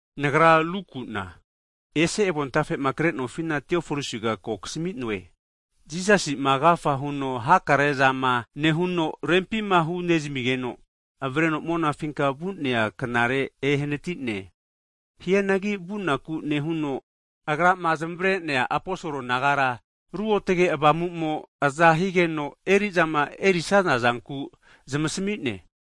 Nagra Luku'na, ese avontafe'ma kre'nofina, Tiofolisiga ko kasmi'noe, Jisasi'ma agafa huno hakarezama nehuno rempima hunezamigeno, avreno monafinka vu'nea knare ehanati'ne. Hianagi vunaku nehuno'a Agrama zamavare'nea aposol nagara ruotge Avamu'mo aza higeno, eri'zama erisaza zankura zamasmi'ne.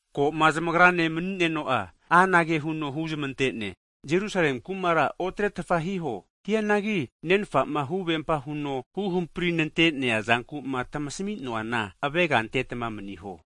Ko'ma zamagrane mani'neno'a, anage huno huzmante'ne, Jerusalemi kumara otretfa hiho. Hianagi Nenfa'ma huvempa huno huhampri ramante'nea zanku'ma tamasmi'noana avega antetma maniho.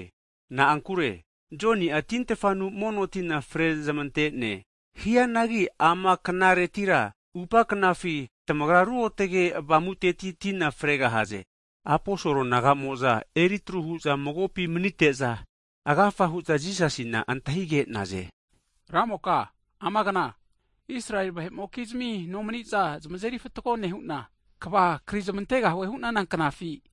Na'ankure Joni'a tintfanu mono tina frezmante'ne, hianagi ama knaretira atupa knafi, tamagra ruotge Avamuteti tina fregahaze. Aposol naga'mo'za eritru hu'za magopi manite'za, agafa hu'za Jisasina antahige'naze. Ramoka amagna, Israeli vahe'mokizmi nomani'za zamazeri fatgo nehu'na, kva krizmantegahue hu'nana knafi?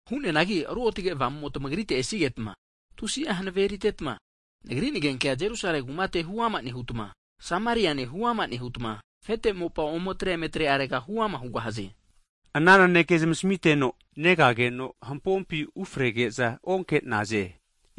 Hu'neanagi ruotge Avamumo tamagrite esigetma, tusi'a hanave eritetma, Nagri nagenkea Jerusalemi kumate huama nehutma, Judiane Sameriane huama nehutma, afete mopa omeatre eme atre arega ome huama hugahaze. Ana naneke zamasmiteno, negageno hampompi ufrege'za onke'naze.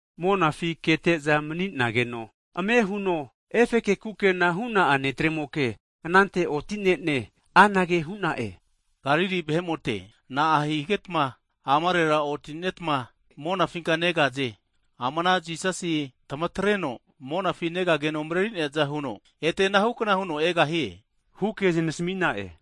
Monafi kete'za mani'nageno, ame' huno efeke kukena hu'na'a ne'tremoke anante oti'ne'ne, anage hu'na'e, Galili vahe'mote na'a higetma amarera oti'netma monafinka negaze? Ama ana Jisasi tmatreno monafi negageno mareri'neaza huno, ete anahu kna huno egahie, huke zamasmi'na'e.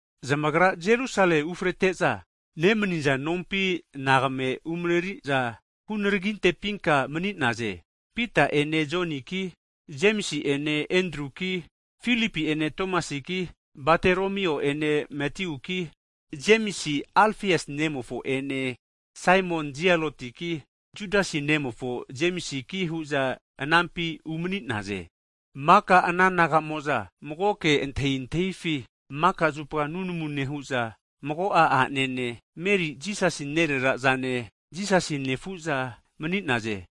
Zamagrama Jerusalemi ufrete'za, nemaniza nompi anagame umareri'za hunaragintepinka mani'naze. Pita ene Joniki, Jemisi ene Endruki, Filipi'ene Tomasiki, Bataromio ene Matiuki, Jemisi Alfiasi nemofo ene Zelati nagapinti ne' Saimoniki, Jemisi nemofo Judasiki hu'za anampi umani'naze. Maka ana naga'mo'za magoke antahintahifi maka'zupa nunamu nehu'za mago'a a'nene, Mariaki Jisasi nerera'ene, Jisasi nefu'zagi hu'za mani'naze.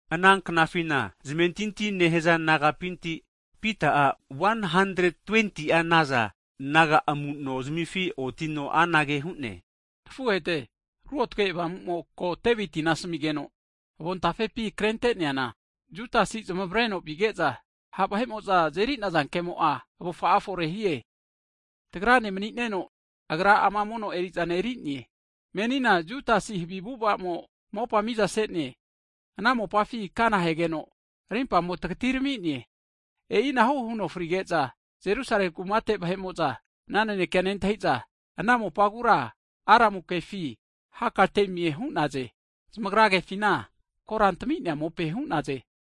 Ana knafina zamentinti nehaza nagapinti Pita'a 120'a naza naga amu'nozamifi otino anage hu'ne. Nafuhete, Ruotge Avamumo ko Deviti asmigeno avontafepima krente'neana, Judasi zamareno vige'za ha' vahe'mo'za azeri'naze kemo'a avufa'a forehie. Tagrane mani'neno, agra ama mono eri'zana eri'ne. (Menina Judasi havi avu'ava'mo ana mopa miza se'ne, ana mopafi kanahegeno rimpamo tagatiramine. E'ina huno frige'za Jerusalemi kumate vahe'mo'za ana naneke nentahi'za ana mopagu Aramu kefi Hakaltemie hu'naze, zamagra kefina Korantami'nea mope hu'naze.)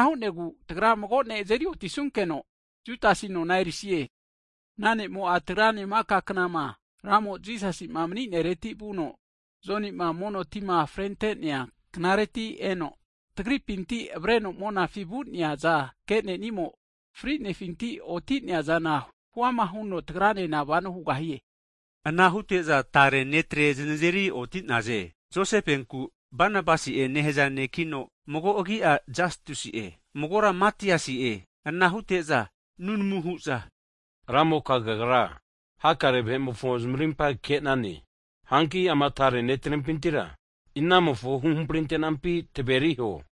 Ana hu'negu tagra mago ne azeri otisunkeno, Judasi nona erisie. Ana ne'mo'a tagrane maka knama, Ramo Jisasi'ma mani'nereti vuno, Joni'ma mono tima fre ante'nea knareti eno, tagripinti avareno monafi vu'neaza ke'nenimo, fri'nefinti oti'neazana huama huno tagranena vano hugahie. Ana hute'za tare ne'tre znazeri oti'naze, Josefenku Banabasi'e (nehaza ne'kino mago' agi'a Jastusi'e) magora Matiasi'e. Ana hute'za nunamu hu'za, Ramoka kagra hakare vahe'mofo zamarimpa ke'nane. Hanki ama tare ne'trenpintira, inamofo huhampri antenampi taveriho.